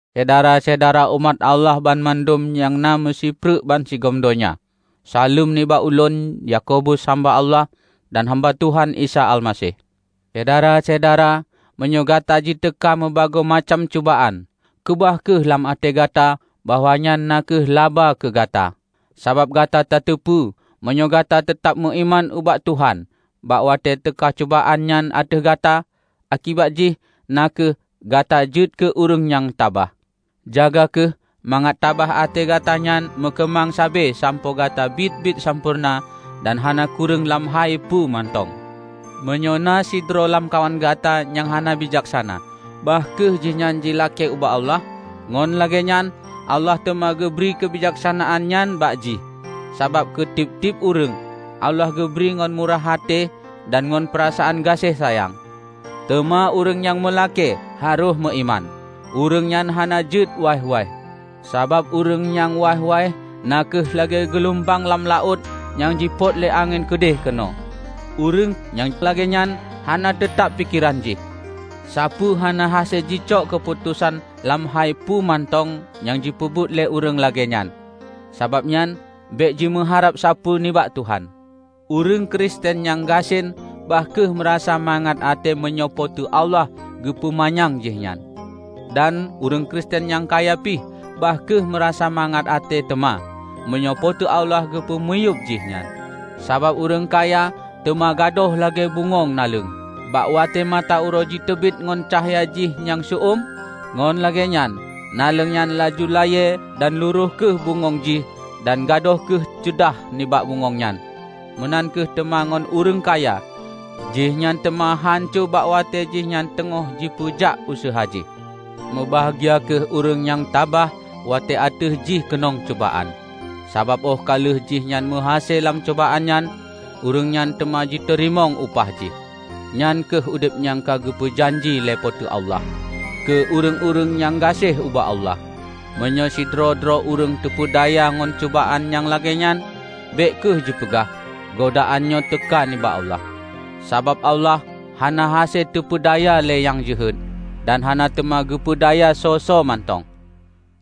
Syedara-syedara umat Allah banmandum nyang na meusipreuk bansigom donya! Saleuem nibak ulôn, Yakobus, hamba Allah dan hamba Tuhan Isa Almaseh. Syedara-syedara! Meunyoe gata jiteuka meubagoe macam cubaan, keubah kheueh lam até gata bahwa nyan na kheueh laba keu gata. Sabab gata tateupeue, meunyoe gata teutab meuiman ubak Tuhan bak watée teuka cubaan nyan ateueh gata, akibat jih na kheueh: gata jeuet keu ureuëng nyang tabah. Jaga kheueh mangat tabah até gata nyan meukeumang sabe sampoe gata biet-biet sampoereuna dan hana kureueng lam hai peue mantong. Meunyoe na sidroe lamkawan gata nyang hana bijaksana, bah kheueh jihnyan jilakée ubak Allah, ngon lagée nyan Allah teuma geubri keubijaksanaan nyan bak jih; sabab keu tieb-tieb ureuëng, Allah geubri ngon murah até dan ngon peurasaan gaséh sayang. Teuma ureuëng nyang meulakée, harôh meuiman; ureuëng nyan hana jeuet waih-waih. Sabab ureuëng nyang waih-waih na kheueh lagée geulumbang lam laôt nyang jipôt lé angén keudeh keunoe. Ureuëng nyang lagée nyan hana teutab pikeran jih; sapeue hana hase jicok keuputosan lam hai peue mantong nyang jipeubuet lé ureuëng lagée nyan. Sabab nyan, bék jimeuharab sapeue nibak Tuhan. Ureuëng Kristen nyang gasien bah kheueh meurasa mangat até meunyoe Po teu Allah geupeu manyang jih nyan. Dan ureuëng Kristen nyang kaya pih bah kheueh meurasa mangat até teuma, meunyoe Po teu Allah geupeumiyueb jih nyan. Sabab ureuëng kaya teuma gadôh lagée bungöng naleueng. Bak watée mata uroe jiteubiet ngon cahya jih nyang seu-uem, ngon lagée nyan naleueng nyan laju layée dan lurôh kheueh bungöng jih dan gadôh kheueh ceudah nibak bungöng nyan. Meunan kheueh teuma ngon ureuëng kaya; jih nyan teuma hanco bak watée jihnyan teungoh jipeujak useuha jih. Mubahgia kheueh ureuëng nyang tabah watée ateueh jih keunong cubaan. Sabab óh ka lheueh jihnyan meuhase lam cubaan nyan, ureuëng nyan teuma jiteurimong upah jih, nyan kheueh udeb nyang ka geupeu janji lé Po teu Allah keu ureuëng-ureuëng nyang gaséh ubak Allah. Meunyoe sidroe-droe ureuëng teupeudaya ngon cubaan nyang lagée nyan, bék kheueh jipeugah, "Godaan nyoe teuka nibak Allah," sabab Allah hana hase teupeudaya lé nyang jeuhet, dan hana teuma geupeu daya soe-soe mantong.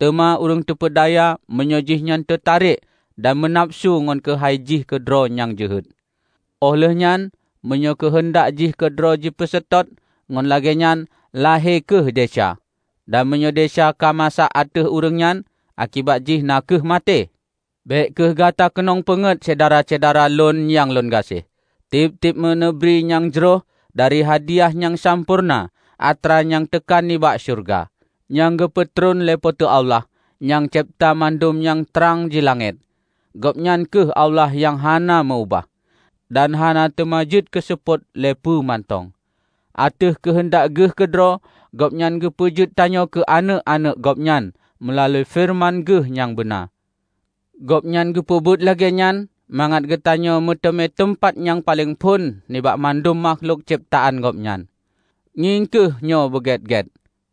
Teuma ureuëng teupeudaya meunyoe jihnyan teutarek dan meunafeusu ngon keuheundak jih keudroe nyang jeuhet. Óh lheueh nyan, meunyoe keuheundak jih keudroe jipeuseutôt, ngon lagée nyan lahé kheueh desya; dan meunyoe desya ka masak ateueh ureuëng nyan, akibat jih na kheueh maté. Bék kheueh gata keunong peungét, Syedara-syedara lôn nyang lôn gaséh! Tieb-tieb meuneubri nyang jroh dan hadiah nyang sampoereuna atra nyan teuka nibak syeuruga, nyang geupeutron lé Po teu Allah, nyang cebta mandum nyang trang di langét. Gobnyan kheueh Allah nyang hana meu-ubah, dan hana teuma jeuet keuseupôt lé peue mantong. Ateueh keuheundak Geuh keudroe Gobnyan geupeujeuet tanyoe keu aneuëk-aneuëk Gobnyan meulalu feureuman Geuh nyang beuna. Gobnyan geupeubuet lagée nyan mangat geutanyoe meuteumé teumpat nyang paleng phon nibak mandum makhlok cebtaan Gobnyan. Ngieng kheueh nyoe beugét-gét,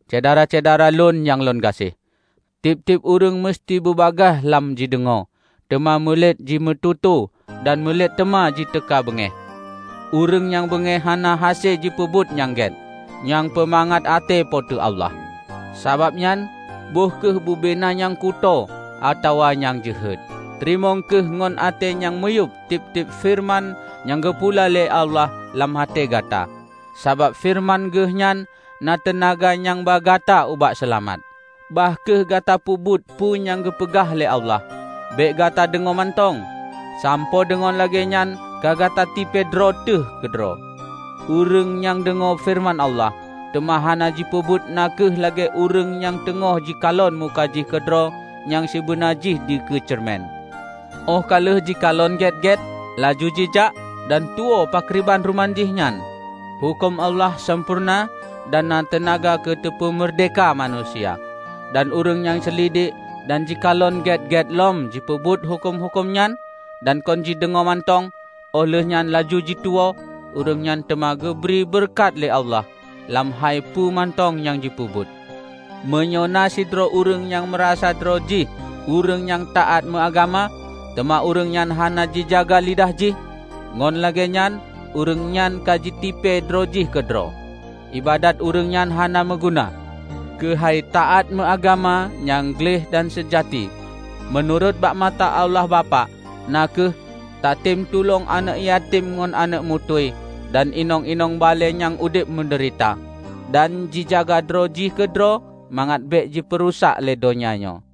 Syedara-syedara lon nyang lôn gaséh! Tieb-tieb ureuëng meuseuti bubagaih lam jideungoe, teuma mulet jimeututoe dan mulet teuma jiteuka beungéh. Ureuëng nyang beungéh hana hase jipeubuet nyang gét, nyang peumangat até Po teu Allah. Sabab nyan, böih kheueh bubena nyang kutoe atawa nyang jeuhet. Teurimong kheueh ngon até nyang miyueb tieb-tieb feureuman nyang geupula lé Allah lam até gata, sabab feureuman Geuh nyan na teunaga nyang ba gata ubak seulamat. Bah kheueh gata peubuet peue nyang geupeugah lé Allah, bék gata deungoe mantong, sampoe deungon lagée nyan ka gata tipée droe teuh keudroe. Ureuëng nyang deungoe feureuman Allah, teuma hana jipeubuet na kheueh lagée ureuëng nyang teungoh jikalon muka jih keudroe nyang sibeuna jih dikeue ceureumen. Óh ka lheueh jikalon gét-gét, laju jijak dan tuwoe pakriban ruman jih nyan. Huköm Allah sampoereuna dan na teunaga keu teupeu meurdehka manusia. Dan ureuëng nyang seulidek dan jikalon gét-gét lom jipeubuet huköm-huköm nyan, dan kon jideungoe mantong óh lheueh nyan laju tuwoe, ureuëng nyan teuma geubri beureukat lé Allah lam hai peue mantong nyang jipeubuet. Meunyoe na sidroe ureuëng nyang meurasa droe jih ureuëng nyang taát meuagama, teuma ureuëng nyan hana jijaga lidah jih, ngon lagée nyan ureuëng nyanka jitipée droe jih keudroe; iébadat ureuëng nyan hana meuguna. Keuhai taát meuagama nyang gleh dan seujati meunurot bak mata Allah Bapak na kheueh: tatem tulông aneuëk yatem ngon aneuëk muntui dan inong-inong balée nyang udeb meudeurita, dan jijaga droe jih keudroe mangat bék jipeurusak lé donya nyoe.